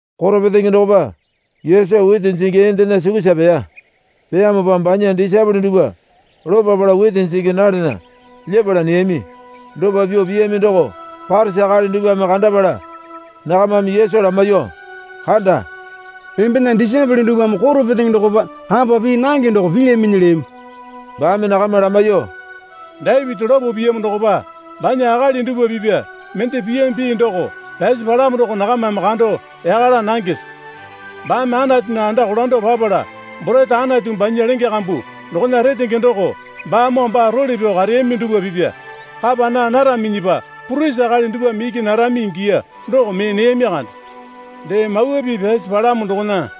Koro petenge dokopa Yesu witi jingi eendena sukusa peya. Peyamopa banya disaepole dupwa lopapala witi jingi nalena lyepala neyami. Dopa pyuo piyami doko Parisi akali dupwame kandapala nakamame Yesu lamaiyuo, Kanda. Embena disaepole dupwame koro petenge dokopa kapa pii nange doko pilyaminyi, leyami. Baame nakama lamaiyuo, Dapiti lopo piyamo dokopa banya akali dupwa pipya mende piyami pii doko pyasi palamo doko nakamame kando yaka laa nangese? Baame Anatunya anda kolando papala borete Anatu banya lenge kambu dokona retenge doko baamoo baa role pyao kareyami dupwa pipya kapa naa naraminyipa purisi akali dupwame iki narami ingiya doko mee neyami kande. Dee Mawa Pii pyasi palamo dokona,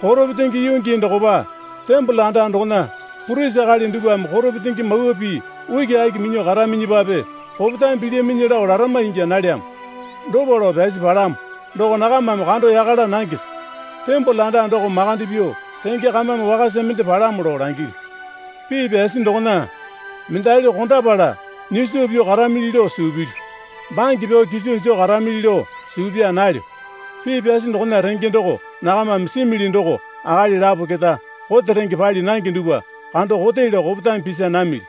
Koro petenge yuu gii dokopa tembole anda dokona purisi akali dupwame koro petenge mawa pii ukiaki minyuo karaminyipape kopetame pilyaminyi lao larama ingya nalyamo, dopa lao pyasi palamo doko nakamame kando yaka laa nangese? Tembole anda doko makande pyuo renge kamame wakasa mende palamo lao langilyu. Pii pyasi dokona, Mendali kondapala nyiso pyuo karamili lao suu pilyu, bange pyao kiso joo karamili lao suu paa nalyo. Pii pyasi dokona renge doko nakamame simili doko akali lapo keta kote renge pali nange dupwa kando kote lao kopetame pisa namili.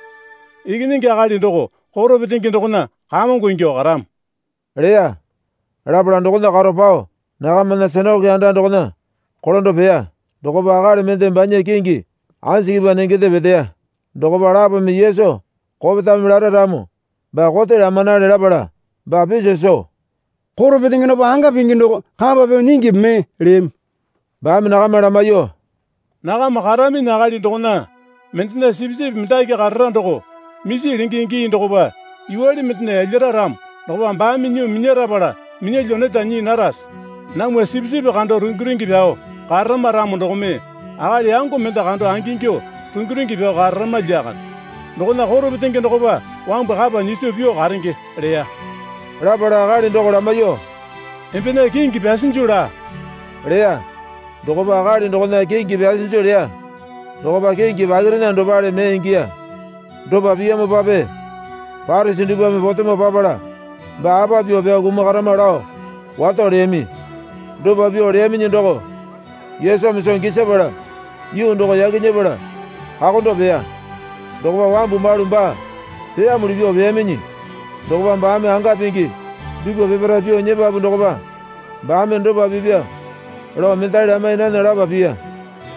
Ikinyingi Akali doko koro petenge dokona kamongo ingyuo karamo, leya. Lapala dokona karo pao nakamana sinakoke anda dokona kolando peya. Dokopa akali mende banya kingi anjikipwa nengende peteya. Dokopa lapome Yesu kopetame lara ramo baa kote lamanale lapala baa piso soo, Koro petenge dokopa anga pingi doko kapa pyuo nyingipi mee? leyami. Baame nakama lamaiyuo, Nakama karaminyi akali dokona mendena sipisipi mendaki karara doko misi lenge gii dokopa yuwale mendena yalyara ramo dokopa baame nyuo minyarapala minyalyuo neta nyii narase? Namwa sipisipi kando rungi rungi pyao kararama ramo dokome akali yango mende kando angingyuo rungi rungi pyao kararama lyakande. Dokona koro petenge dokopa wambu kapa nyiso pyuo karenge leya. Lapala akali doko lamaiyuo, Embena kingi pyasinju laa, leya. Dokopa akali dokona kingi pyasinju leya dokopa kingi pakirena dopale mee ingiya. Dopa piyamopape Parisi dupwame potemo papala baa apa pyuo pyao kumakarama lao wato leyami. Dopa pyuo leyaminyi doko Yesumi soo gisapala yuu doko yaki nyepala kakondo peya. Dokopa wambu malu baa peyamuli pyuo peyaminyi dokopa baame anga pingi dupwa peparae pyuo nyepapu dokopa baame dopa pipya lao mendali lamai nana lapa piya.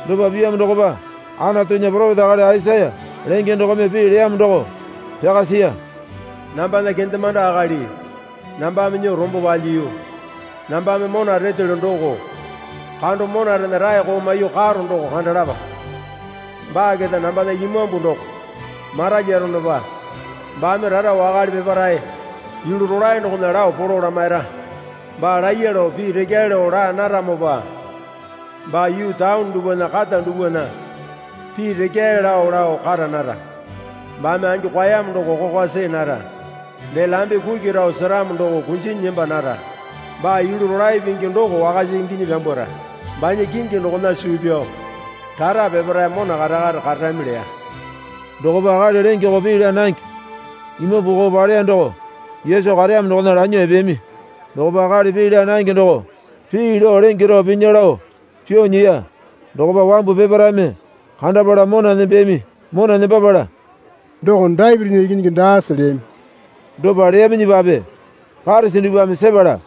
Dopa piyamo dokopa Anatunya poropeta akali Aisaya lenge dokome pii leyamo doko pyaka siya. Nambana kendemande akali nambame nyuo rombo palyiyu, nambame mona retelyo doko kando monarena raeko maiyuo karo doko kandalapa. Baa keta nambana imambu doko maralyaronopa baame rara wakale peparae yulu rolae dokona lao polo lamaira. Baa laiya lao pii rekyae lao laa naramopa baa yuu taone dupwana kata dupwana pii rekyae lao lao kara nara. Baame angi kwaeyamo doko kokwa see nara. Dee lambe kuki rao seramo doko kunjinyi nemba nara. Baa yulu rolae pingi doko wakasa inginyi pyambwara. Banya kingi dokona suu pyao rara peparae mona kare kare kararami leya. Dokopa akali lenge koo pii laa nange imambu koo paleya doko Yesu kareyamo dokona lanyuo epeyami. Dokopa akali pii laa nange doko pii lao lenge rao pinya lao pyuo nyiya. Dokopa wambu peparaeme kandapala mona nembeyami Mona nembapala, Doko Dapitinya Ikinyingi daase? leyami. Dopa leyaminyipape Parisi dupwame sepala,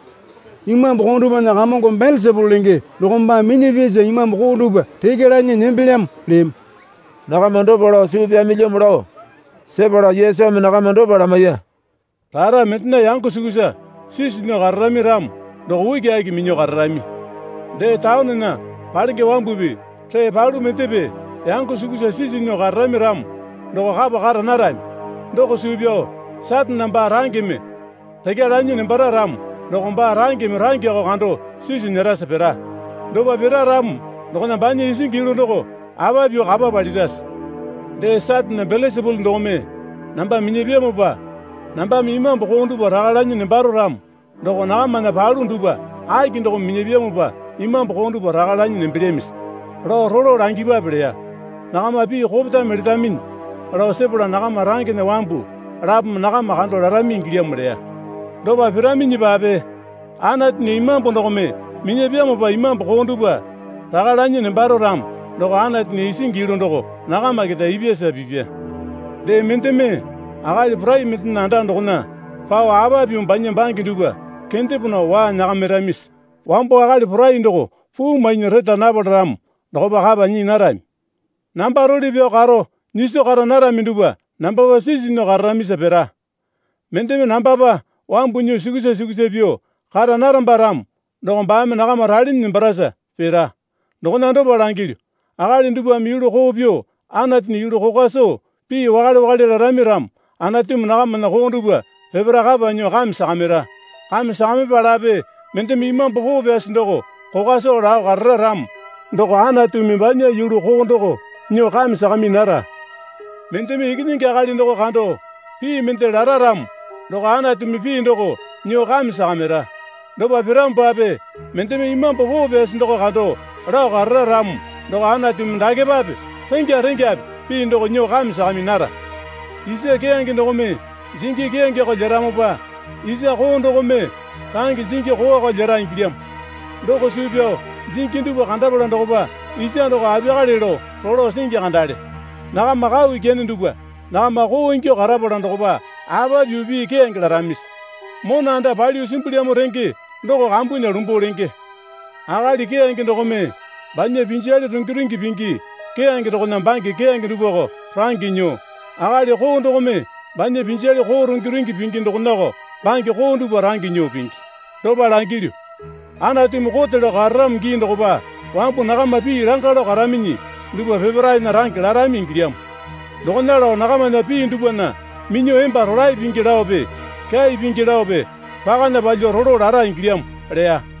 Imambu koo dupwana kamongo Belesapulu lenge dokome baa minyapyasa imambu koo dupwa rekya lanyi nembelyamo, leyami. Nakama dopa lao suu pyamilyamo lao sepala Yesumi nakama dopa lamaiya. Rara mendena yango sukusa sisu nyuo kararami ramo doko ukiaki minyuo kararami. Dee, taonena palenge wambupi ree palu mendepe yango sukusa sisu nyuo kararami ramo doko kapa kara narami. Doko suu pyao Satane baa rangeme rekya lanyi nembara ramo doko baa rangeme rangeko kando sisu nyerasa pira. Dopa pira ramo dokona banya isingi yulu doko apa pyuo kapa palirase? Dee, Satane Belesapulu dokome namba minyapyamopa nambame imambu koo dupwa raka lanyi nembaro ramo doko nakamana palu dupwa aki dokome minyapyamopa imambu koo dupwa raka lanyi nembelyamisi? Lao rolo langipwape leya. Nakama pii kopetame letaminyi lao sepala nakama rangena wambu lapome nakama kando larami ingilyamo leya. Dopa piraminyipape Anatunya Imambu dokome minyapyamopa imambu koo dupwa raka lanyi nembaro ramo doko Anatunya isingi yulu doko nakama keta ipyasa pipya. Dee, mendeme akali porai mendena anda dokona pao apa pyuo banya bange dupwa kendepo nao waa nyakamiramisi? Wambo akali porai doko puu mainyi reta napala ramo dokopa kapa nyii narami. Namba role pyao karo nyiso kara narami dupwa nambapa sisu nyuo kararamisa pira. Mendeme nambapa wambu nyuo sukusa sukusa pyuo kara naramba ramo doko baame nakama ralinyi nembarasa pira. Dokona dopa langilyu. Akali dupwame yulu koo pyuo Anatunya yulu kokwa soo pii wakale wakale larami ramo Anatumi nakamana koo dupwa peparae kapa nyuo kame sakamira. Kame sakamipalape mendeme Imambu Poo Pyasi doko kokwa soo lao karara ramo doko Anatumi banya yulu koo doko nyuo kame sakami nara. Mendeme Ikinyingi Akali doko kando pii mende lara ramo doko Anatumi pii doko nyuo kame sakamira. Dopa piramopape mendeme Imambu Poo Pyasi doko kando lao karara ramo doko Anatumi dakepape rengya rengyape pii doko nyuo kame sakami nara. Isa keyange dokome jingi keyangeko lyeramopa isa koo dokome range jingi koowako lyera ingilyamo. Doko suu pyao jingi dupwa kandapala dokopa isa doko apiyakale lao rolo singi kandale. Nakama kau ikyane dupwa. Nakama koo ingyuo karapala dokopa apa pyuo pii keyange laramisi? Mona anda palyuo simbulyamo renge doko kambunya lumbuo lenge. Akali keyange dokome banya pinjale rungi rungi pingi keyange dokona bange keyange dupwako range nyuo, akali koo dokome banya pinjale koo rungi rungi pingi dokonako bange koo dupwa range nyuo pingi. Dopa langilyu, Anatumi kote lao kararamo gii dokopa wambu nakama pii langa lao karaminyi dupwa peparaena range larami ingilyamo. Dokona lao nakamana pii dupwana minyuo emba rolae pingi laope kyai pingi laope pakana palyuo rolo lara ingilyamo, leya.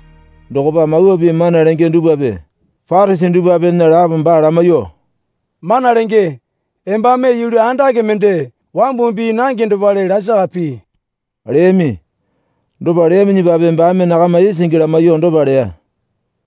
Dokopa Mawa Pii mana lenge dupwape Parisi dupwapena lapome baa lamaiyuo, Mana Lenge, Embame yulu andake mende wambumi pii nange dopale lasaka pii, leyami. Dopa leyaminyipape baame nakama isingi lamaiyuo dopa leya,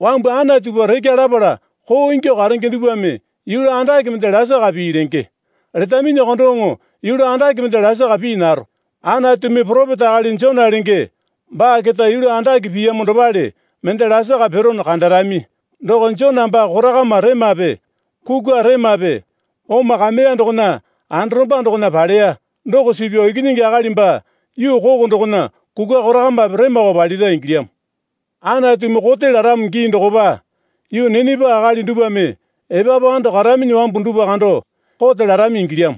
Wambu Anatupa rekya lapala koo ingyuo karenge dupwame yulu andake mende lasaka pii lenge. Letaminyako doŋo yulu andake mende lasaka pii naro. Anatumi poropeta akali Jona lenge baa keta yulu andake piyamo dopale mende lasaka pirono kandarami. Doko Jona baa korakama remape kukwa remape oma kameya dokona anda romba dokona paleya doko suu pyao Ikinyingi Akali baa yuu koko dokona kukwa korakamape remako palira ingilyamo. Anatumi kote laramo gii dokopa yuu Ninepa akali dupwame epapu ando karaminyi wambu dupwa kando kote larami ingilyamo.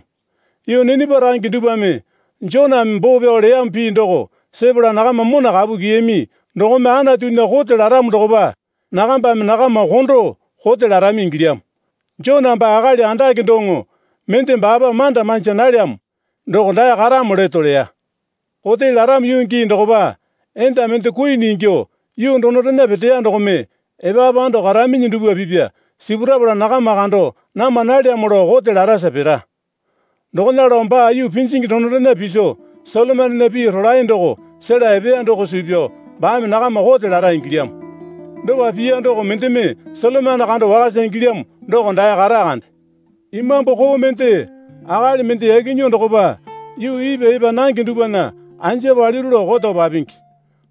Yuu Ninepa range dupwame Joname boo pyao leyamo pii doko sepala nakama mona kapu kyiyami dokome Anatunya kote laramo dokopa nakambame nakama kondo kote larami ingilyamo. Jona baa akali andake doŋo mende baapa manda manja nalyamo doko dae karamo leto leya. Kote laramo yuu gii dokopa enda mende kuini ingyuo yuu donorena peteya dokome epapu ando karaminyi dupwa pipya sipurapala nakama kando nama nalyamo lao kote larasa pira. Dokona lao baa yuu pinjingi donorena piso Solomonena pii rolae doko sela epeya doko suu pyao baame nakama kote lara ingilyamo. Dopa piya doko mendeme Solomone kando wakasa ingilyamo doko dae kata kande. Imambu koo mende akali mende yaki nyuo dokopa yuu ipwa epa nange dupwana anja paliru lao koto papingi.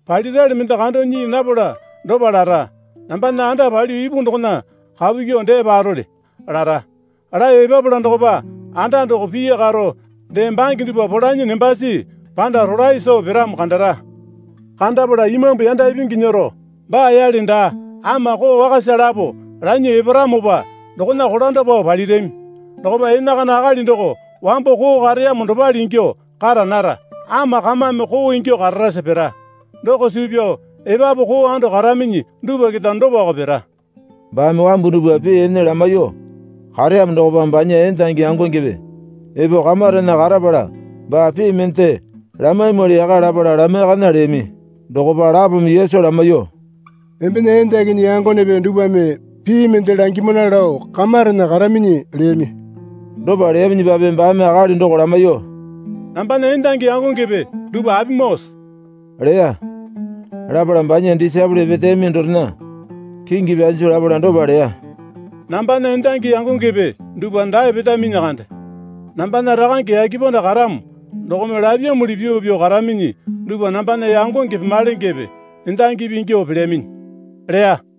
Palirali mende kando nyii napala dopa lara. Nambana anda palyuo ipu dokona kapu kyuo dee parole, lara. Laeyo epapala dokopa anda doko pii karo dee bange dupwa polanyi nembasi panda rolae soo piramo kandara. Kandapala imambu yanda ipingi nyero baa yale daa, ama koo wakasa lapo lanyuo eparamopa dokona kolando pao palirami. Dokopa enakana akali doko wambo koo kareyamo dopale ingyuo kara nara, ama kamame koo ingyuo kararasa pira. Doko suu pyao epapu koo ando karaminyi dupwa keta dopako pira. Baame wambu dupwa pii ene lamaiyuo kareyamo dokopa banya endangi yangongepe epo kamarena karapala baa pii mende lamaimwali yaka lapala lamaiyakana leyami. Dokopa lapome Yesu lamaiyuo, Embena endakinyi yangonepe dupwame pii mende langimana lao kamarena karaminyi, leyami. Dopa leyaminyipape baame akali doko lamaiyuo, Nambana endangi yangongepe dupwa apimoose? leya. Lapala banya disaepole peteyami dorena kingi pyasinju lapala dopa leya. Nambana endangi yangongepe dupwa dae petaminyi kande. Nambana Rakange yake panda karamo dokome lapyamuli pyuo pyuo karaminyi dupwa nambana yangonge pemalenge endangipi ingyuo pelyaminyi leya.